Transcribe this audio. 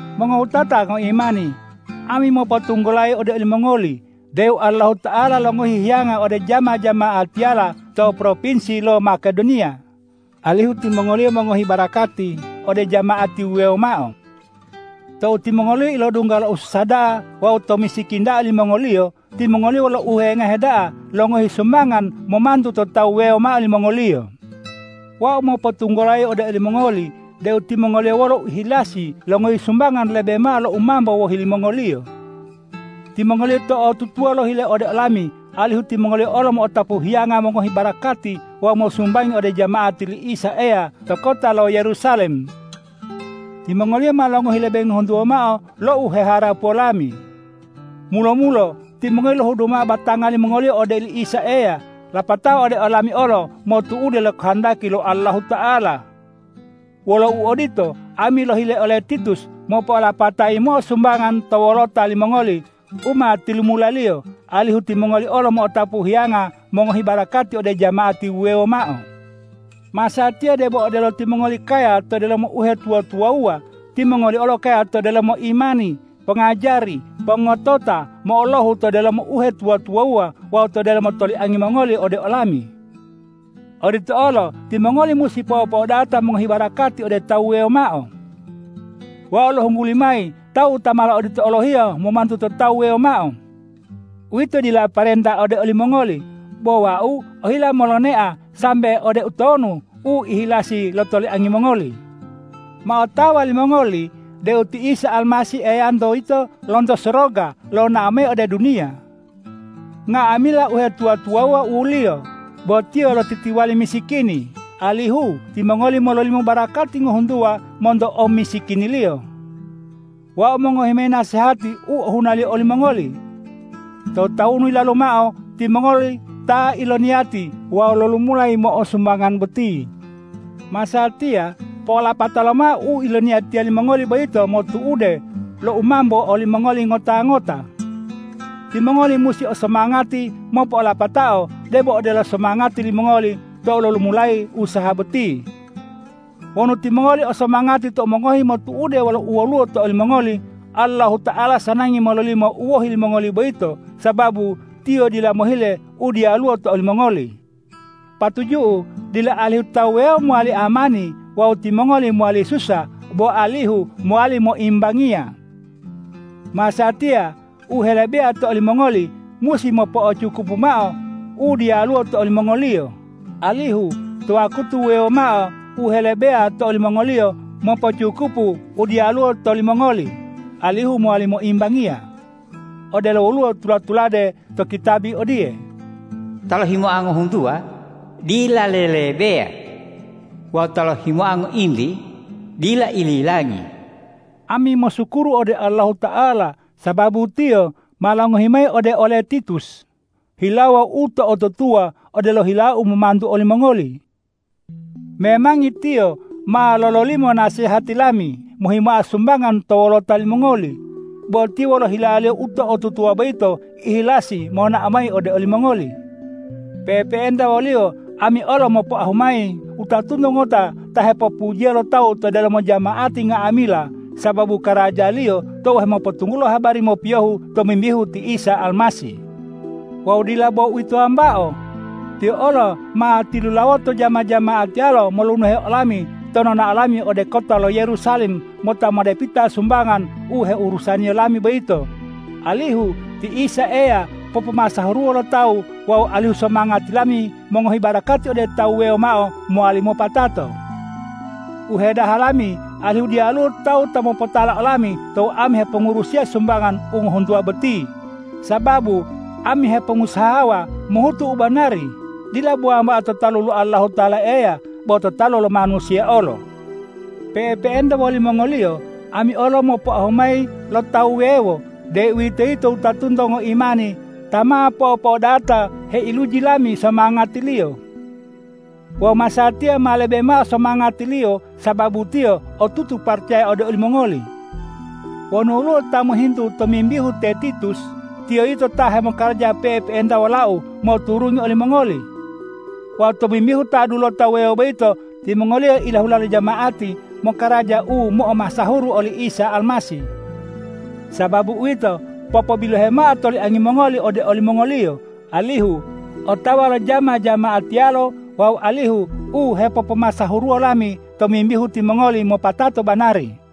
Mongowutata ngoimani, ami mopotunggulayi ode olimongoli deu Allahuta'ala longohi hiyanga ode jama-jama'atiyala to propinsi lo Makedoniya, alihu timongoliyo mongohi barakati ode jama'ati wuwewo mao. Tou timongoliyo ilodungga lo ususa da'a wawu to omisikini da'a limongoliyo, timongoliyo wolo uhewengahe da'a longohi sumbangan momantu to tawu wuwewo mao limongoliyo. Wau mopotunggulayi ode olimongoli deu timongoliyo wolo uihilasi longohi sumbangan lebe mao lo u mambo wohi limongoliyo. Timongoliyo to'otutuwa lohile ode olami alihu timongoliyo olo mo'otapu hiyanga mongohi barakati wawu mosumbangi ode jama'ati li Isa Eya to kota lo Yerusalem. Timongoliyo ma longohi lebe ngohuntuwa mao lo u heharapuwo lami. Mulo-mulo timongoliyo lohudu mao batanga limongoliyo ode oli Isa Eya, lapatao ode olami olo motu'ude lo kohondaki lo Allahuta'ala. Wolo uodito, ami lohile ole Titus mopo'olapata yimo'o sumbangan to wolota limongoli u ma tilumulaliyo, alihu timongoli olo mo'otapu hiyango mongohi barakati ode jama'ati wuwewo mao. Masatiya debo odelo timongoli kaya to delomo uhetuwa-tuwawuwa, timongoli olo kaya to delomo imani, pongajari, pongotota, mo'olohu to delomo uhetuwa-tuwawuwa wawu to delomo toliangi mongoli ode olami. Odito olo timongoli musi po'opo'odata mongohi barakati ode tawu wuwewo mao. Wau lohungguli mayi tawu ta malo odito olohiyo momantu to tawu wuwewo mao. Uwito dila parenta ode olimongoli, bo wau ohila molonea sambe ode utonu uihilasi lo toliangi mongoli. Ma otawa limongoli deu ti Isa Almasih Eyanto yito lonto soroga lonao mayi ode duniya. Nga'amila uhetuwa-tuwawuwa u-Liyo, bo Tiyo lotitiwali misikini, alihu timongoli mololimo barakati ngohuntuwa monto omisikini-Liyo. Wau mongohi mayi nasehati u ohunaliyo olimongoli. To tawunu yilalu mao timongoli ta iloniyati wawu lolumula yimo'o sumbangan boti. Masatiya po'olapata lomao u iloniyatiya limongoli boyito motu'ude lo u mambo olimongoli ngota-ngota! Timongoli musi o somangati mopo'olapatao debo odelo somangati limongoli tou lolumulayi usaha boti. Wonu timongoli o somangati tou mongohi motu'ude wolo u woluwo to olimongoli, Allahuta'ala sanangi mololimo u wohi limongoli boyito, sababu Tiyo dila mohile u diyaluwo to olimongoli. Patuju'u dila alihu tawu wuwewo mowali amani wawu timongoli mowali susa bo alihu mowali moimbangiya. Masatiya u helebeya to olimongoli musi mopo'ocukupu mao u diyaluwo to olimongoliyo, alihu to wakutu wuwewo mao u helebeya to olimongoliyo mopo'ocukupu u diyaluwo to limongoli alihu mowali moimbangiya. Odelo woluwo u tula-tulade to kitabi odiye,”Ta lohimoa ngohuntuwa dila lelebeya wawu ta lohimoa ngointi dila ililangi.” Ami mosukuru ode Allahuta'ala sababu Tiyo ma longohi mayi ode ole Titus hilawo u to'otutuwa odelo hilau momantu olimongoli. Memangi tiyo ma lololimo nasehati lami mohimoa sumbangan to wolota limongoli, bo tiyo wolo hilaliyo u to'otutuwa boyito ihilasi monao mayi ode olimongoli. Pe'epe'enta woliyo ami olo mopoahu mayi wutatunto ngota ta hepopujiya lo tawu to delomo jama'ati nga'amila sababu karajaliyo tou hemopotunggulo habari mopiyohu tomimbihu ti Isa Almasih. Wawu dila bo uwito wambao! Tiyo olo ma tilulawoto jama-jama'atiyalo molunuhe olami to nonao lami ode kota lo Yerusalem mota modepita sumbangan u heurusaniyo lami boyito, alihu ti Isa Eya popomasahuruwo lo tawu wawu alihu somangati lami mongohi barakati ode tawu wuwewo mao mowali mopatato. U hedaha lami alihu diyaluwo tawu ta mopotala olami tou ami hepongurusiya sumbangan u ngohuntuwa boti, sababu ami hepongusahawa mohutu u banari, dila bo wambao to talu lo Allahuta'ala Eya, bo to talu lo manusiya olo. Pe'epe'enta wolimongoliyo ami olo mopoahu mayi lo tawu wuwewo, deuwitoyito wutatunto ngoimani ta ma po'opo'odata heiluji lami somangatiliyo. Wawu masatiya ma lebe mao somangatiliyo sababu tiyo otutu paracaya ode olimongoli. Wonu woluwo ta mohintu tomimbihu te Titus, tiyo yito ta hemokaraja pe'epe'enta wolau moturungi olimongoli. Wawu tomimbihu ta dulota wuwewo boyito, timongoliyo ta ilahula lo jama'ati mokaraja u mo'omasahuru oli Isa Almasih. Sababu uwito, popobilohe mao toliangi mongoli ode olimongoliyo, alihu otawa lo jama-jama'atiyalo wawu alihu u hepopomasahuruwo lami tomimbihu timongoli mopatato banari.